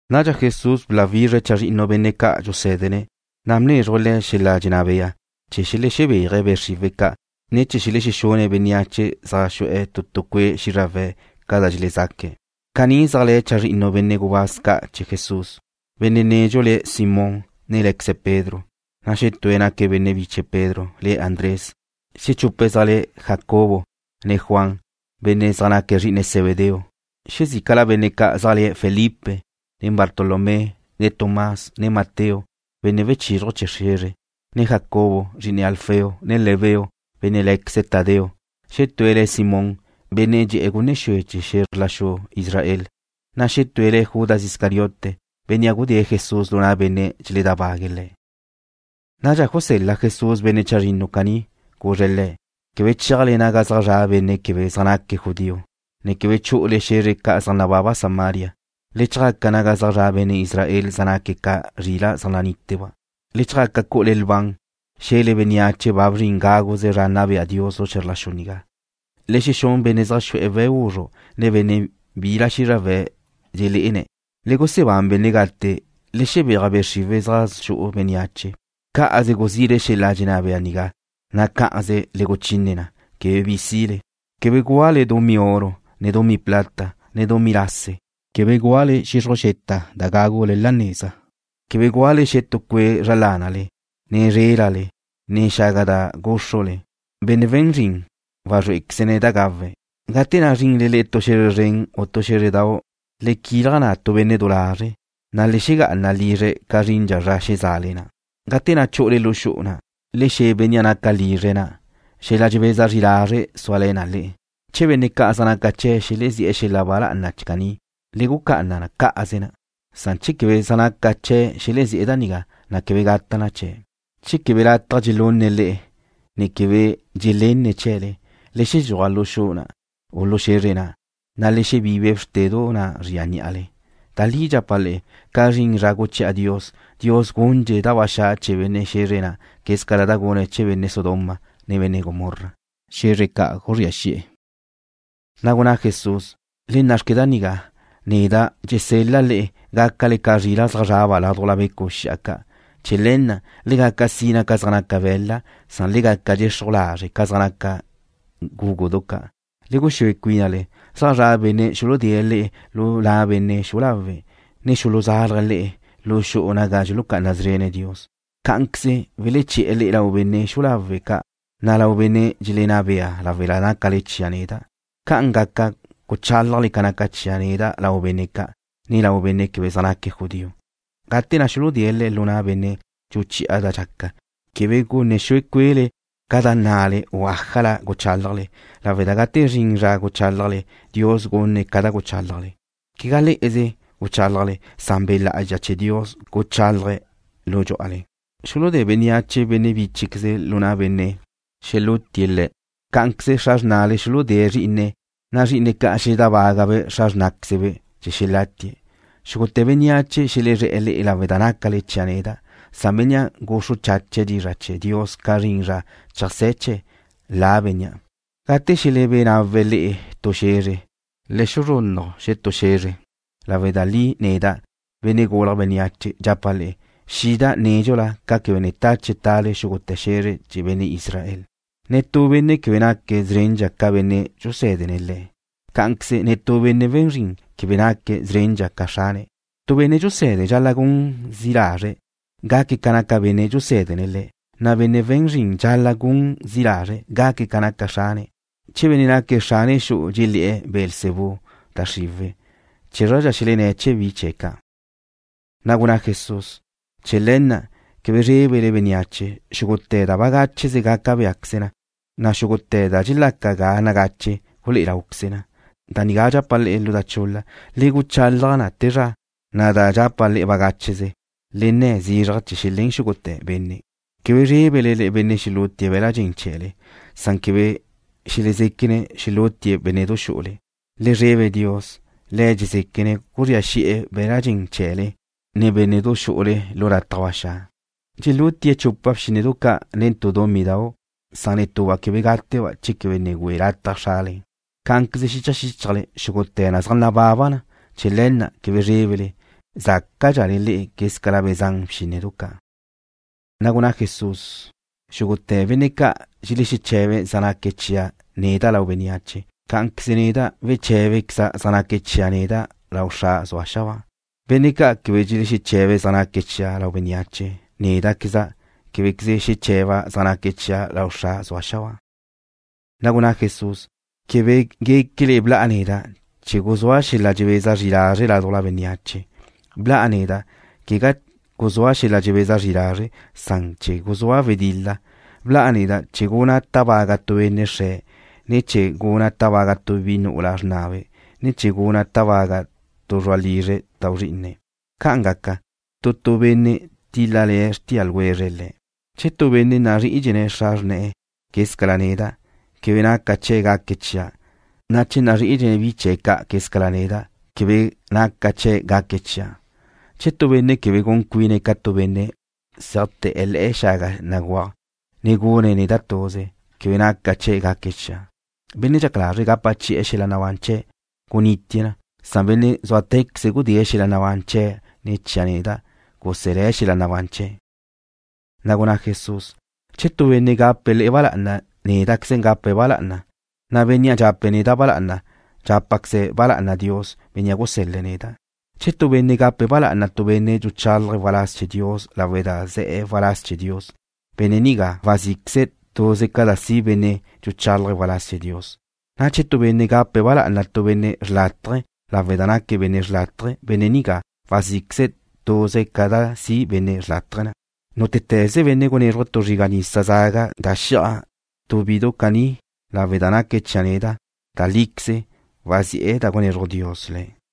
Nadxa Jesús bláwizre̱' chazrinnu benne' ca' dxusé̱dene̱', na' bnézruje̱' le̱' xel-la' dxenná bea chee̱ xelexebéaje̱' be' xriwe̱' ca', ne chee̱ xelexexune̱' bénneache zaj xu'e̱ tu tu cue' xízrawe̱' ca da dxelezaque̱'. Caní zaj le̱ chazrinnu benne' gubáz ca' chee̱ Jesús: Benne' nedxu le̱' Simón, ne lé̱queze̱' Pedro. Xetúe̱' naque̱' benne' biche Pedro, le̱' Andrés. Xechupe̱' zaj le̱' Jacobo, ne Juan, benne' zaj naque̱' zri'ine Zebedeo. Xezícala benne' ca' zaj le̱' Felipe, ne Bartolomé, ne Tomás. Xetue̱' le̱' Mateo, benne' wechizruj chee̱ xe̱zre. Xetue̱' le̱' Jacobo, zri'ine Alfeo. Xetue̱' le̱' Lebeo, benne' lé̱queze̱' Tadeo. Xetúe̱' le̱' Simón, benne' dxe'e̱ gunne xue chee̱ xe̱zr la xu Israel. Xetúe̱' le̱' Judas Iscariote, bénnea' gudée̱' Jesús lu na' benne' dxeledábague̱' Le̱'. Nadxa gusel-la Jesús benne' chazrinnu caní. Guzre̱' le̱': ―Quebe cheajle naga zaj zra' benne' quebe zaj naque̱' judío, ne quebe chu'ule xe̱zre ca' zaj nababa Samaria. Le chjaca naga zaj zra' benne' Israel zaj naque̱' ca zrila' zaj naníteba'. Le chjaca cu'ule lban, xe̱le bénneache ba bzrin gáguze zra nna bea Dios lu xe̱zr la xu nigá. Le xexún benne' zaj xu'e̱ we̱' guzru', ne benne' bila xízrawe̱' dxelé'ene̱'. Le gusebán benne' gate. Le xebéaj be' xriwe̱' da zaj xu'u bénneache. Cá'aze guzile xel-la' dxenná bea nigá, na' cá'aze le guchine na, quebe bi sile. ’Quebe gúale dumí oro, ne dumí plata, ne dumí lase. Quebe gúale xixruj xeta da gágule la neza. Quebe gúale xetú cue' zra lánale, ne zrélale, ne xaga da gúxrule. Benne' we̱n zrin wazrúequeze̱' da gawe̱'. ’Gate na' zrinle le'e tu xe̱zre zren u tu xé̱zredau', le quilaj na' tu benne' du lazre', na' le xegá'ana lizre̱' ca zrindxa zra xeza'ale na'. Gate na' chu'ule lu xu'u na', le xe̱ bénnea' naca lizre̱' na': “Xela dxebeza zri lazre' suale̱ na le'e.” Che benne' ca' zaj naca chee̱' xelezí'e̱ xel-la' ba lá'ana caní, le gucá'ana cá'aze na. Che quebe zaj naca chee̱' xelezí'e̱ da nigá, na' quebe gata' chee̱'. Che quebe lataj dxelune̱' le'e, ne quebe dxelenne̱' chee̱le, le xedxúaj lu xu'u na' u lu xe̱zre na', na' le xebibe bxrtedu na' zria ní'ale. Da li dxapa' le'e, ca zrin zra guchi'a Dios, Dios gundxe̱' da ba xa' chee̱ benne' xe̱zre na' quez ca da gune̱' chee̱ benne' Sodoma, ne benne' Gomorra, xe̱zre ca' guzría xi'e̱. Na' gunná Jesús: ―Le na' xque nigá. Neda' dxesel-la' le'e, gácale ca zrila' zaj zraba' ládujla becu' xi'a ca'. Chee̱ le̱ na', le gaca sina ca zaj naca be̱la', san le gaca dxexruj lazre' ca zaj naca bgúgudu ca'. Le guxúe cuínale. Zaj zra' benne' xuludée̱' le'e lu na' benne' xu'u lawe', ne xuluzálaje̱' le'e lu xu'u naga dxulucá'ana szrene̱' Dios. Cá'anqueze weleché̱'e̱ le'e lau benne' xu'u lawe' ca', ne lau benne' dxelenná bea lawe' da nácale chia' neda'. Ca'an gaca guchálajle ca naca chia' neda' lau benne' ca', ne lau benne' quebe zaj naque̱' judío. Gate na' xuludée̱' le'e lu na' benne' dxuchi'a da dxaca, quebe gunne xue cue'le ca da nnale u ájala guchálajle, lawe' da gate zrin zra guchálajle, Dios gunne̱' ca da guchálajle. Quegá le'eze guchálajle, lawe' da Be' Lá'azxa chee̱ Dios guchálaje̱' lu dxú'ale. ’Xuludé bénneache benne' bíchequeze̱' lu na' benne' xelútie̱' le̱'. Cá'anqueze xra xrna xuludée̱' zrí'ine̱', na' zrí'ine̱' ca' xeledábagabe' xra xrnáquezebe' chee̱ xelátie̱'. Xúgute̱ bénneache xelezré̱'e̱ le'e lawe' da nácale chia' neda', san bénnea' guxru chache̱' dizra' chee̱ Dios ca zrin zra cheajsé̱ chee̱', la bénnea'. Gate xelebé nawe̱' le'e tu xe̱zre, le xuzrunnuj xetú xe̱zre. Da li neda', Benne' Gulje̱' Bénneache, dxapa' le'e, xida' nédxula ca quebe ne tache tale xúgute̱ xe̱zre chee̱ benne' Israel. ’Netú benne' quebe naque̱' szrendxa ca benne' dxusé̱dene̱' le̱'. Cá'anqueze netú benne' we̱n zrin quebe naque̱' szrendxa ca xrane̱'. Tu benne' dxuse̱de dxal-la' gun zi' lazre̱' gaque̱' ca naca benne' dxusé̱dene̱' le̱', na' benne' we̱n zrin dxal-la' gun zi' lazre̱' gaque̱' ca naca xrane̱'. Che benne' naque̱' xrane xu'u dxelé̱'e̱ le̱' Beelzebú, da xriwe̱', chezradxa xelenné̱' chee̱ bi chee̱' ca'. Na' gunná Jesús: ―Chee̱ le̱ na', quebe zrébele bénneache. Xúgute̱ da bagácheze gaca béaqueze na, na' xúgute̱ da dxelaca ga nagache gulé'e láuqueze na. Da nigá dxapa' le'e lu da chul-la, le guchalaj na te zra. Da dxapa' le'e bagácheze, le nne̱ zizraj chee̱ xelén xúgute̱ benne'. Quebe zrébele benne' xelútie̱' be̱l-la' dxen chee̱le. Quebe xelezéquene̱' xelútie̱' bénne'du xu'ule. Le zrebe Dios. Le̱' dxezéquene̱' guzría xi'e̱ be̱l-la' dxen chee̱le, ne bénne'du xu'ule lu lataj ba xa'. ’Dxelúti'e̱ chupa bxínnedu ca' nen tu dumídau'. Netuba' quebe gáteba' chee̱ quebe ne güe lataj Xrale. Cá'anqueze xicha xíchajle, xúgute̱ na zaj nababa na. Chee̱ le̱ na', quebe zrébele. Zácadxale le'e quézcala be̱ zan bxínnedu ca'. Na' gunná Jesús: ―Xúgute̱ benne' ca' dxelexeche̱be̱' zaj naque̱' chia' neda' lau bénneache, cá'anqueze neda' weché̱bequeza' zaj naque̱' chia' neda' lau Xra' zue̱' xabáa. Benne' ca' quebe dxelexeche̱be̱' zaj naque̱' chia' lau bénneache, néda'queza' québequeze xeche̱ba' zaj naque̱' chia' lau Xra' zue̱' xabáa. Na' gunná Jesús: ―Quebe guéquele bla'a neda' chee̱ guzúa' xel-la' dxebeza zri lazre' ládujla bénneache. Bla'a neda', quegá chee̱ guzúa' xel-la' dxebeza zri lazre', san chee̱ guzúa' wedil-la. Bla'a neda' chee̱ guna' tábaga' tu benne' xre̱', ne chee̱ guna' tábaga' tu bi nu'ula xrnabe', ne chee̱ guna' tábaga' tu zru'a lizre̱' tau zrí'ine̱'. Ca'an gaca, tu tu benne' tíl-lale̱ xrtía ljwezre̱' le̱'. ’Che tu benne' nazrí'idxene̱' xra xrne̱'e̱ quezca neda', quebe naca chee̱' gaque̱' chia', na' che nazrí'idxene̱' bi chee̱' ca' quezca neda', quebe naca chee̱' gaque̱' chia'. Che tu benne' quebe gun cuine̱' ca tu benne' zéajte̱'e̱ le̱'e̱ xaga béguaj, ne gune̱' neda' tuze, quebe naca chee̱' gaque̱' chia'. Benne' dxaca lazre̱' gapa chi'e̱ xel-la' nabán chee̱' gunitie̱' na. Bénnea' zúatequeze gudée̱' xel-la' nabán chee̱' ne̱ chia' neda', guselé̱' xel-la' nabán chee̱'. Na' gunná Jesús: ―Che tu benne' gape̱' le'e ba lá'ana, néda'queze gape̱' ba lá'ana, na' bénnea' dxape̱' neda' ba lá'ana, dxápaqueze̱' ba lá'ana Dios, Bénnea' gusel-le̱' neda'. Che tu benne' gape̱' ba lá'ana tu benne' dxuchalaje̱' waláz chee̱ Dios lawe' da ze̱'e̱ waláz chee̱ Dios, benne' nigá wazí'queze̱' tuze ca da si' bénnea' dxuchálaje̱' waláz chee̱ Dios. Na' che tu benne' gape̱' ba lá'ana tu benne' xrlátaje lawe' da naque̱' benne' xrlátaje, benne' nigá wazí'queze̱' tuze ca da si' benne' xrlátaje na'. Nútete̱ze benne' gunézruje̱' tu zriga' nisa zaga da xi'aj tu bidu caní lawe' da naque̱' chia' neda', da líqueze wazi'e̱ da gunezruj Dios le̱'.